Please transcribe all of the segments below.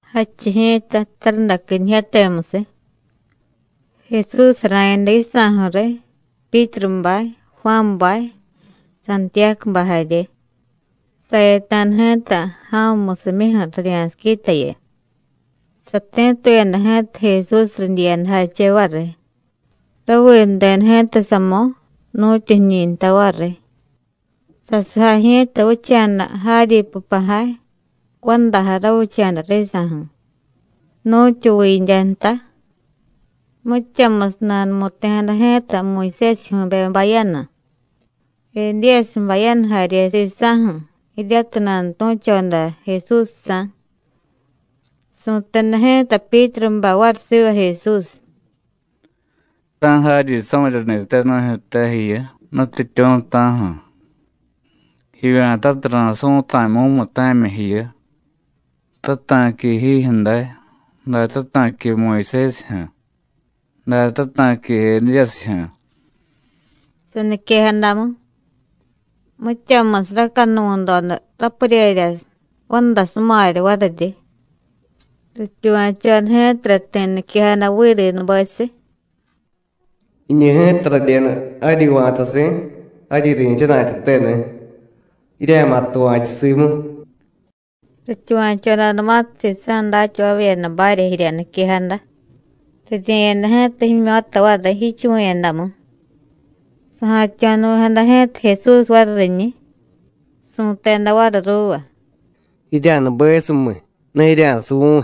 Jadchiy ji̱ta tarundaquinijyatemusiy, Jesús jara̱yada yisa̱ju̱ riy Pyítrubay, Juánbay, Santiyácubay jarye, sayata̱da ji̱ta ja̱mumusimyuju̱ rirya̱siquitayu. Sati̱tuyada ji̱ta Jesús ridyiyadajache variy. Raviideda ji̱ta samo̱, nu̱tyu jiñi̱ nta variy, sasujay ji̱ta vicha̱da jaryi pupajay, vandajay ravicha̱da risa̱ju̱, nu̱tyu vindya nta. Mityamusiy nanumu̱ti̱jada ji̱ta Muyusésijyu̱be bayanu, Edíyasiy bayanu jarye sisa̱ju̱, jiryatiy nanutu̱choda Jesúsjsa̱. Su̱teda ji̱ta Pyítrubay variy siva Jesús: “¡Ta̱ jaryi samiryani̱te nu̱jyu̱te jiyu, Nutyityu̱, ta̱ju̱! Jivya̱tatiy, ra̱su̱ta̱y mumuta̱myi jiyu, tata̱qui jijyu̱ day, da tata̱qui Muyusésijyu̱, da tata̱qui Edíyasijyu̱.” Saniquejadamu, mityamusiy racanuvu̱doda rapuryerya vandasumarya variryi. Rityuva̱choda ji̱tara ti̱ niquejada virinubesiy: “¡Jiñu ji̱ta radyenu jaryi va̱tasi̱, jaryi ri̱chana̱tyateni̱! ¡Jirya̱ma̱ tuva̱chu simu!” Rityuva̱chodanumatiy sisa̱ datyavavyedabarya jirya niquejada, rirye̱yada ji̱ta jimyo̱ta variy, jichuvu̱yadamu. Saja̱tyo̱nuvi̱jada ji̱ta Jesús variy riñiy, su̱teda variy ruuva: “Jirya̱nubesumiy, ne jirya̱suvu̱y.”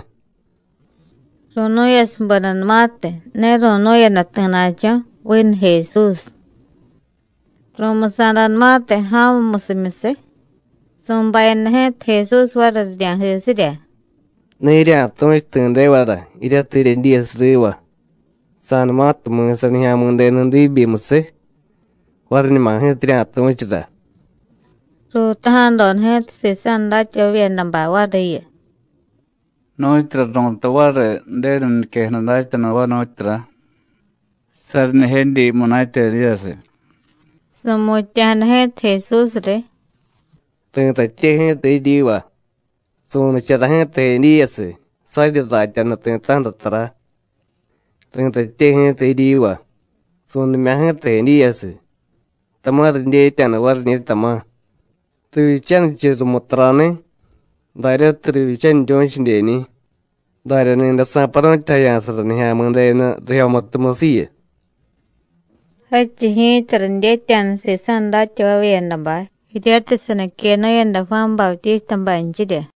Ru̱nu̱yasubedanumatiy, ne ru̱nu̱yada ti̱na̱cho̱, vinu Jesús. Ru̱musa̱danumatiy ja̱mumusimyusiy, su̱bayada ji̱ta Jesús variy rirya̱jisirya: “Ne jirya̱tu̱chu ti̱devara jiryatiy jiryedyiyasiy riva. Sa̱numatiy mi̱sa Nijya̱mi̱denu diibyimusiy, variñuma ji̱ta jirya̱tu̱chura.” Ruutaja̱doda ji̱ta sisa̱ datyavavyedabay variyu: “¿Nu̱tyura ru̱tay variy Ju̱denu niquejada datyanuvay, nu̱tyura? Saryi jnijedyi munatya Edíyasiy.” Su̱mutya̱jada ji̱ta Jesús riy: “Ri̱tatye ji̱ta jiryiva: Su̱nichara ji̱ta Edíyasiy, saryi ratyanu ti̱ta̱ju̱ra tara. Ri̱tatye ji̱ta jiryiva: Su̱nimya̱ ji̱ta Edíyasiy, tama̱ ridyetya̱da variñi̱, tama̱, rivyichanichiy rumu tarani̱, daryatiy rivyichaniryu̱chidyeñi̱. Darya ni̱day sa̱paru̱tyajaya̱sara Nijya̱mi̱denu rijyomutumusiyu.” Jadchiy ji̱ta ridyetya̱da sisa̱ datyavavyedabay jiryatiy saniquenu̱yada Juán Bautístabaynchirya.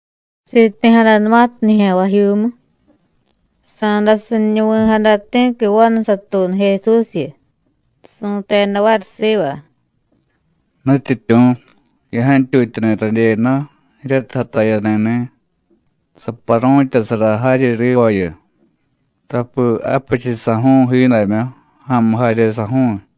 Siti̱jadanumatiy nijya̱nvajyuumu, sa̱dasiñunuvi̱jada ti̱qui vanu satuunu Jesúsyu, su̱teda variy siva: “Nutyityu̱, ya̱jantyutyani̱ radyenu jiryatiy jatayani̱ni̱, saparu̱tyasara jaryi rivayu, tapi japichiy saju̱u̱y jiidamyu, ja̱a̱mu jarye saju̱u̱y.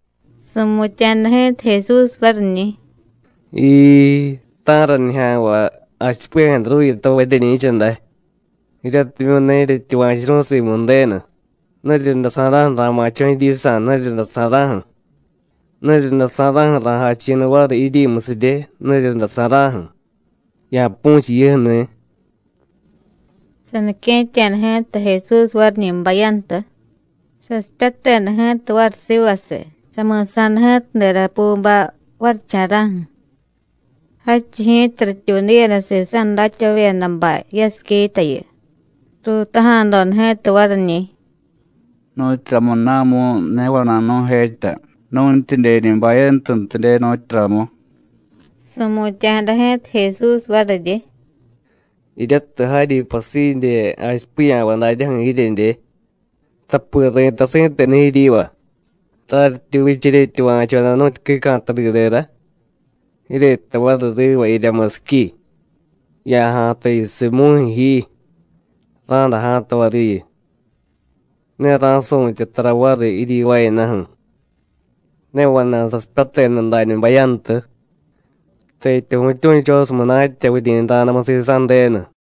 Su̱mutya̱jada ji̱ta Jesús variñi̱: “¡Jiii, ta̱ra nijya̱nvay jachipiya̱jadaruyutavay jiryeñi̱cha day, jiryatimyu̱ ne jiryetyuva̱churu̱y simu Ju̱denu! ¿Nuriryundasa̱ra̱ju̱ ra̱ma̱cho̱ jiryisa̱, nuriryundasa̱ra̱ju̱? ¿Nuriryundasa̱ra̱ju̱ ra̱jachi̱niy variy jiryimusirye, nuriryundasa̱ra̱ju̱? Ya̱pu̱chiy jiyuju̱ni̱.” Sanique̱tya̱da ji̱ta Jesús variñi̱ bayantu, sasipyateda ji̱ta variy sivasiy, sami̱sa̱da ji̱ta derapubay varicha̱ra̱ju̱. Jadchiy ji̱ta rityuudiyada sisa̱ datyavavyedabay yasiquitayu, ruutaja̱doda ji̱ta variñi̱: “¿Nu̱tyuramuna̱mu̱y ne vana̱y nu̱jetya nu̱ntyidyeñi̱ bayantuntidye, nu̱tyuramu?” Su̱mutya̱jada ji̱ta Jesús variryi: “Jiryatiy jaryi pasidye jachipiya̱vay daryaju̱ jiryedye. Tapi ri̱tay si̱tenu jiryiva: Raryityi vicha jiryetyuva̱choda nu̱tyu quica̱tadidera, jiryejtay variy riva jirya musiqui: Ya̱ja̱ta jiyusiy mu̱jyu̱ ji, ra̱day ja̱ta variyu. Ne ra̱su̱tye tara variy jiryivaayadaju̱. Ne vana̱y sasipyateda dañu bayantu, tetya vu̱tyu̱chosiy munatya vuryi̱nra̱damu sisa̱ Ju̱denu.”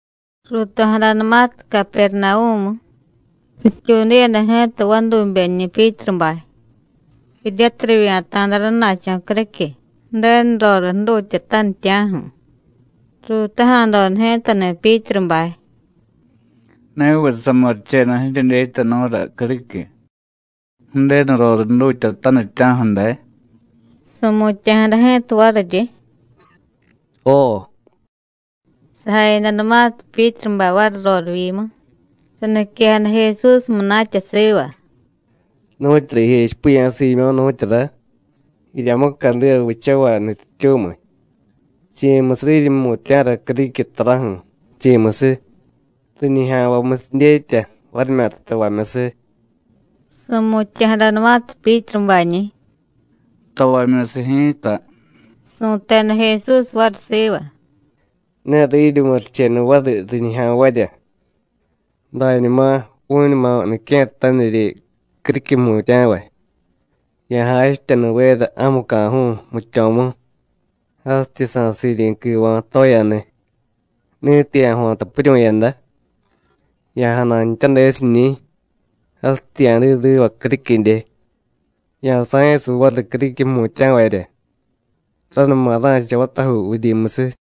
Ruuto̱jadanumatiy Capernavú̱mu, rityuudiyada ji̱ta vadubeñi̱ Pyítrubay, jiryatiy rivya̱ta̱da rana̱cho̱ criquiy, Ju̱denu roriy jdutyatanitya̱ju̱. Ruutaja̱doda ji̱tani̱ Pyítrubay: “¿Neviy samurichenu jiryedyetyanu̱ra criquiy, Ju̱denu roriy jdutyatanitya̱ju̱ day?” Su̱mutya̱jada ji̱ta variryi: “Jo.” Sajayadanumatiy Pyítrubay variy rorivyimu, saniquejada Jesús munatya siva: “¿Nu̱tyura jijechipiya̱ Siimyó̱, nu̱tyura? Jirya mucadiva vichavay nutyityu̱miy, ¿chi̱musiy riryi jmutya̱ra criquiy taraju̱, chi̱musiy? ¿riñijya̱nvamyusiy dyetya, varimyata tavamyusiy?” Su̱mutya̱jadanumatiy Pyítrubañi̱: “Tavamyusiy ji̱ta,” su̱teda Jesús variy siva: “Ne riryi murichenu variy riñijya̱nvarya. Dañuma, vu̱ñuma nique̱ttaniryi criquiy jmutya̱vay, ya̱jachityanuvera ja̱muca̱ju̱u̱ jmityo̱mu, jasityi sa̱siryi̱ quiva̱ toyaniy. Ni̱tiy ya̱jo̱ta piryu̱yada, ya̱janantyadesiñi̱, jasityi ya̱diy riva criquidye. Ya̱sa̱yasiy variy criquiy jmutya̱varya, ranuma ra̱cha vatajuu vuryimusiy.”